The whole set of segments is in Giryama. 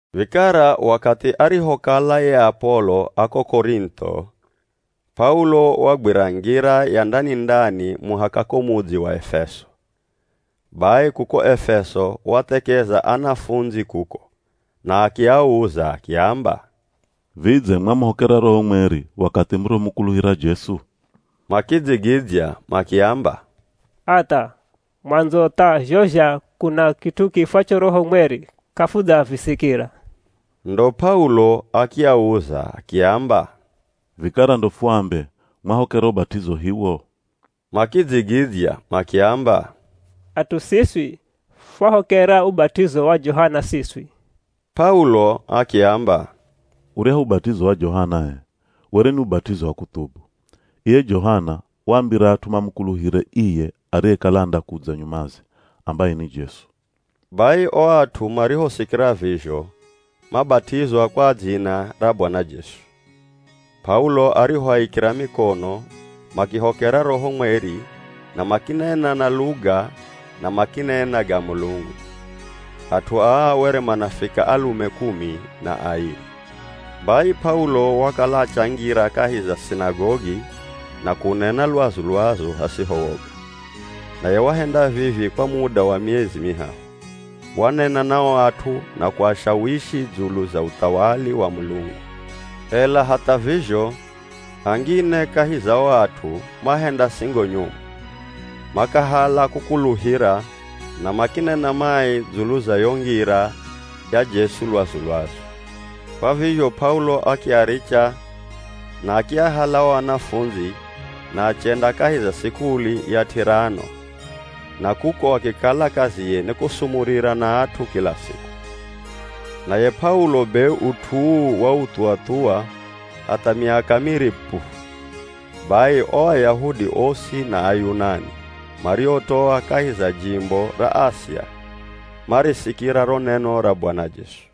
Vikara wakathi arihokala ye Apolo a ko Korintho, P'aulo wagwira ngira ya ndani-ndani muhaka ko mudzi wa Efeso. Bai kuko Efeso wathekeza anafundzi kuko, na akiauza akiamba, “Vidze mwamuhokera Roho Mweri wakathi murihomukuluhira Jesu?” Makidzigidzya makiamba, “Hatha. Mwandzo tha zho zha kuna kit'u kiifwacho Roho mweri, k'afudzavisikira.” Ndo P'aulo akiauza akiamba, “Vikara ndo fuambe, mwahokera ubat'izo hiwo?” Makidzigidzya makiamba, “At'u siswi fwahokera ubat'izo wa Johana siswi.” P'aulo akiamba, “Uryahu ubat'izo wa Johana h'e, were ni ubat'izo wa kuthubu. Iye Johana waambira at'u mamukuluhire iye ariyekala andakudza nyumaze, ambaye ni Jesu.” Bai o at'u marihosikira vizho, mabat'izwa kwa dzina ra Bwana Jesu. P'aulo arihoaikira mikono, makihokera Roho mweri na makinena na luga na makinena ga Mulungu. At'u aa were manafika alume kumi na airi. Bai P'aulo wakala achangira kahi za sinagogi na kunena lwazu-lwazu hasiho woga, naye wahenda vivi kwa muda wa miezi mihahu. Wanena na o at'u na kuashawishi dzulu za uthawali wa Mulungu. Ela hatha vizho angine kahi za o at'u mahenda singo nyomu, makahala kukuluhira na makinena mai dzulu za yo ngira ya Jesu lwazu-lwazu. Kwa vizho P'aulo akiaricha na akiahala o anafundzi na achenda kahi za sikuli ya T'irano na kuko akikala kaziye ni kusumurira na at'u kila siku. Naye P'aulo be ut'u uu wauthuwa-thuwa hatha miaka miri pu, bai o Ayahudi osi na Ayunani mariotoa kahi za jimbo ra Asia marisikira ro neno ra Bwana Jesu.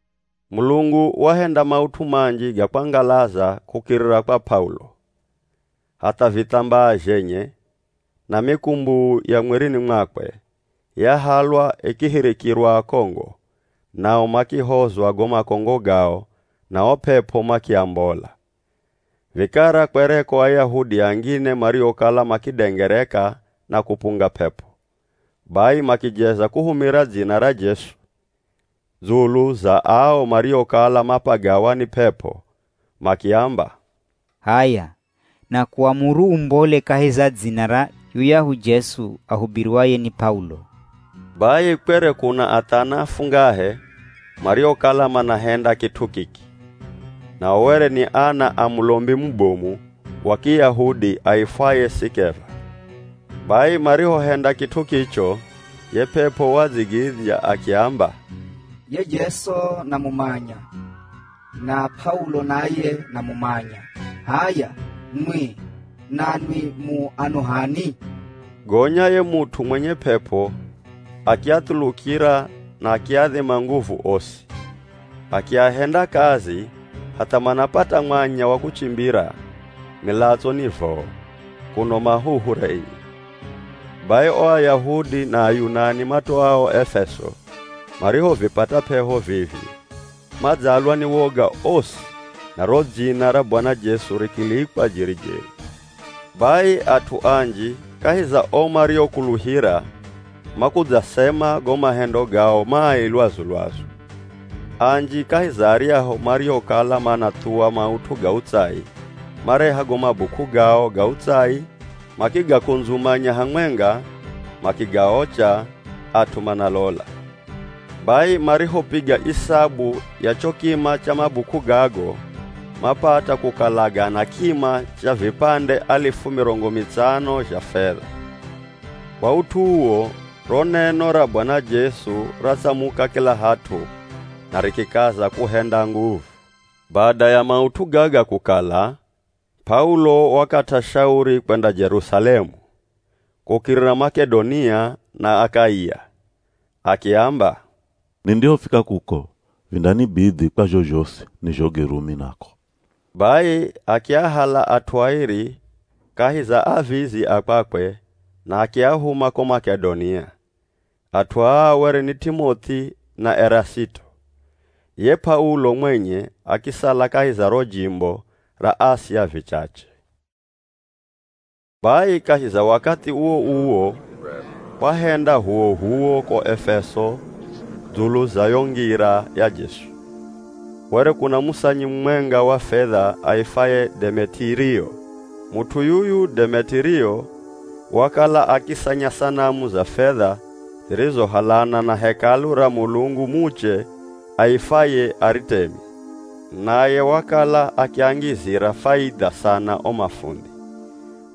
Mulungu wahenda maut'u manji ga kwangalaza kukirira kwa P'aulo. Hatha vithambaa zhenye na mikumbuu ya mwirini mwakwe, yahalwa ikihirikirwa akongo, nao makihozwa go makongo gao na o p'ep'o makiambola. Vikara kwereko Ayahudi angine mariokala makidengereka na kupunga p'ep'o. Bai makijeza kuhumira dzina ra Jesu dzulu za ao mariokala mapagawa ni p'ep'o, makiamba, “H'aya nakuamuru umbole kahi za dzina ra yuyahu Jesu ahubiriwaye ni P'aulo.” Bai kwere kuna athana afungahe mariokala manahenda kit'u kiki, nao were ni ana a mulombi mubomu wa Kiyahudi aifwaye Sikeva. Bai marihohenda kit'u kicho ye p'ep'o wadzigidzya akiamba, “Ye Jesu namumanya, na P'aulo naye namumanya, h'aya nwi nanwi mu ano h'ani?” Gonya ye mut'u mwenye p'ep'o akiathulukira na akiadhima nguvu osi, akiahenda kazi, hatha manapata mwanya wa kuchimbira, milatso ni voo, kuno mahuhu renye. Bai o Ayahudi na Ayunani matoao Efeso, marihovipata p'eho vivi madzalwa ni woga osi na ro dzina ra Bwana Jesu rikilikwa jeri-jeri. Bai at'u anji kahi za o mariokuluhira makudzasema go mahendo gao mai lwazu-lwazu. Anji kahi za aryahu mariokala manathuwa maut'u ga utsai mareha go mabuk'u gao ga utsai makigakundzumanya hamwenga makigaocha at'u manalola. Bai marihopiga isabu ya cho kima cha mabuk'u gago, mapata kukala gana kima cha vipande alifu mirongo mitsano zha fedha. Kwa ut'u uwo, ro neno ra Bwana Jesu ratsamuka kila hat'u na rikikaza kuhenda nguvu. Bada ya maut'u gaga kukala, P'aulo wakat'a shauri kwenda Jerusalemu, kukirira Mak'edonia na Akaia. Akiamba, “Nindihofika kuko, vindanibidhi kwa zho zhosi nizhoge Rumi nako.” Bai akiahala at'u airi kahi za avizi a kwakwe na akiahuma ko Mak'edonia. At'u aa were ni T'imoth'i na Erasito. Ye P'aulo mwenye akisala kahi za ro jimbo ra Asia vichache. Bai kahi za wakathi uwo-uwo kwahenda h'uwoh'uwo ko Efeso dzulu za yo Ngira ya Jesu. Were kuna musanyi mumwenga wa fedha aifwaye Demetirio. Mut'u yuyu Demetirio wakala akisanya sanamu za fedha zirizohalana na Hekalu ra mulungu muche aifwaye Aritemi, naye wakala akiangizira faidha sana o mafundhi.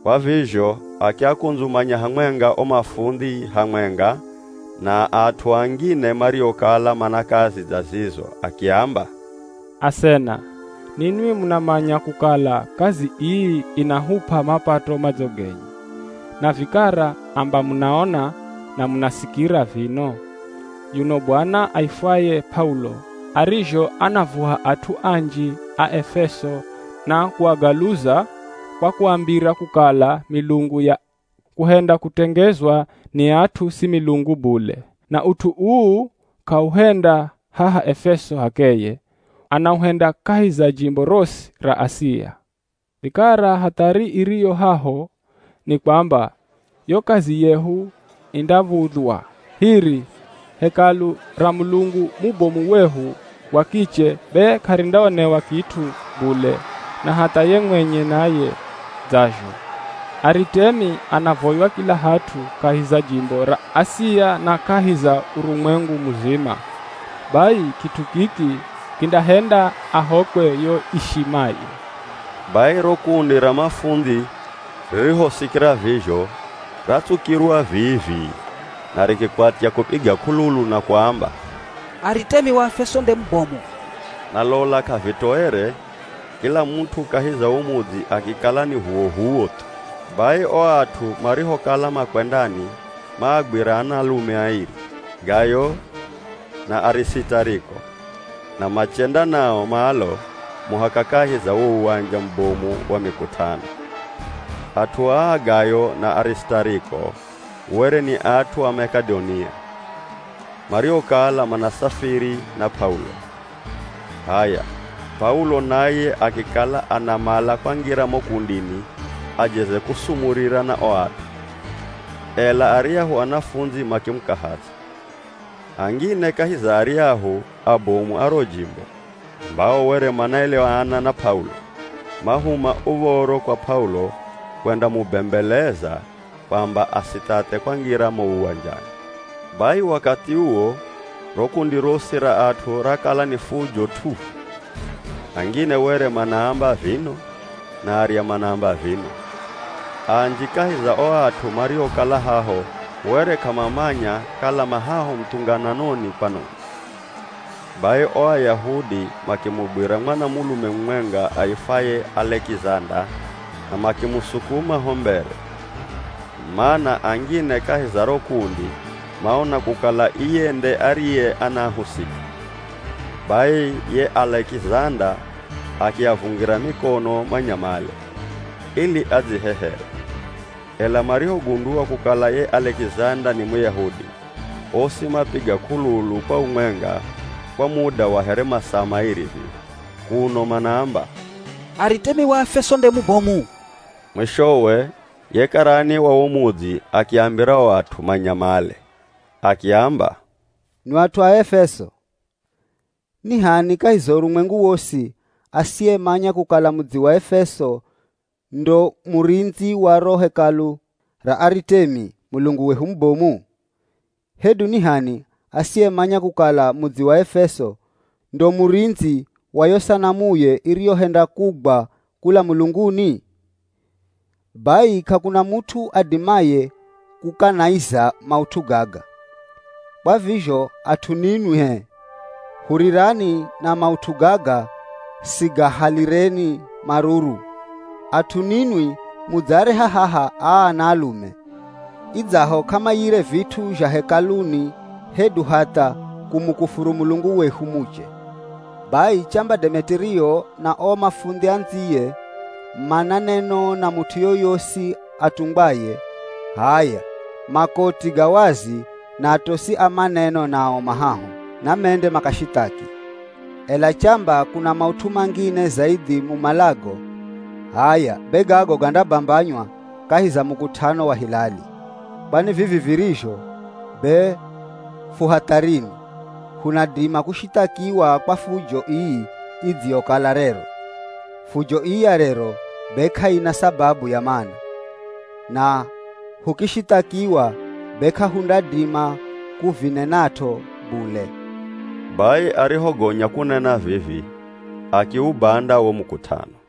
Kwa vizho akiakundzumanya hamwenga o mafundhi hamwenga na at'u angine mariokala mana kazi dza zizo akiamba, “Asena, ninwi munamanya kukala kazi ii inahup'a mapato madzo genye. Na vikara amba munaona na munasikira vino, yuno bwana aifwaye P'aulo arizho anaavuha at'u anji a Efeso na kuagaluza, kwa kuambira kukala milungu ya kuhenda kutengezwa ni at'u si milungu bule. Na ut'u uu k'auhenda haha Efeso h'akeye, anauhenda kahi za jimbo rosi ra Asia. Vikara hathari iriyo haho ni kwamba yo kazi yehu indav̱udhywa. Hiri, hekalu ra mulungu mubomu wehu wa kiche be k'arindaonewa kit'u bule na hatha ye mwenye naye dzazho. Aritemi anavoywa kila hat'u kahi za jimbo ra Asia na kahi za urumwengu muzima, bai kit'u kiki kindahenda ahokwe yo ishimaye.” Bai ro kundi ra mafundhi ririhosikira vizho ratsukirwa vii-vii na rikikwatya kupiga k'ululu na kuamba, “Aritemi wa Aefeso nde mubomu!” Na lola k'avitoere kila mut'u kahi za wo mudzi akikala ni h'uwoh'uwo thu. Bai o at'u marihokala makwendani, maagwira anaalume airi, Gayo na Arisitariko na machenda nao malo muhaka kahi za wo uwanja mubomu wa mikut'ano. At'u aa Gayo na Arisitariko were ni at'u a Mak'edonia mariokala manasafiri na P'aulo. H'aya, P'aulo naye akikala anamala kwangira mo kundini ajeze kusumurira na o at'u, ela aryahu anafundzi makimukahaza. Angine kahi za aryahu abomu a ro jimbo, ambao were manaeleana na P'aulo, mahuma uv̱oro kwa P'aulo kwendamubembeleza kwamba asithathe kwangira mo uwanjani. Bai wakathi uwo ro kundi rosi ra at'u rakala ni fujo t'uhu. Angine were manaamba vino, na arya manaamba vino. Anji kahi za o at'u mariokala haho were k'amamanya kala ma haho muthungananoni kwanoni. Bai o Ayahudi makimugwira mwanamulume mumwenga aifwaye Alekizanda na makimusukuma ho mbere, mana angine kahi za ro kundi maona kukala iye nde ariye anahusika. Bai ye Alekizanda akiavungira mikono manyamale, ili adzihehere. Ela marihogundua kukala ye Alekizanda ni Muyahudi, osi mapiga k'ululu kwa umwenga kwa muda wa here masaa mairi vivi, kuno manaamba, “Aritemi wa Aefeso nde mubomu!” Mwishowe ye karani wa wo mudzi akiambira o at'u manyamale. Akiamba, “Nwi at'u a Efeso! Ni h'ani kahi za urumwengu wosi asiyemanya kukala mudzi wa Efeso ndo murindzi wa ro Hekalu ra Aritemi, mulungu wehu mubomu? Hedu ni h'ani asiyemanya kukala mudzi wa Efeso ndo murindzi wa yo sanamuye iriyohenda kugwa kula mulunguni? Bai k'akuna mut'u adimaye kukanaiza maut'u gaga. Kwa vizho at'u ninwi h'e, hurirani na maut'u gaga sigahalireni maruru. At'u ninwi mudzaareha haha aa anaalume, idzaho k'amaiyire vit'u zha hekaluni hedu hatha kumukufuru mulungu wehu muche. Bai chamba Demetirio na o mafundhi andziye mana neno na mut'u yoyosi atungwaye, h'aya makoti ga wazi na atosi a maneno nao ma haho, na mende makashithaki. Ela chamba kuna maut'u mangine zaidhi mumalago, h'aya be gago gandabambanywa kahi za mukut'ano wa hilali. Kwani vivi virizho, be fu hatharini, hunadima kushithakiwa kwa fujo ii idziyokala rero. Fujo ii ya rero be k'aina sababu ya mana, na hukishithakiwa be k'ahundadima kuvinenat'o bule.” Bai arihogonya kunena vivi, akiubanda wo mukut'ano.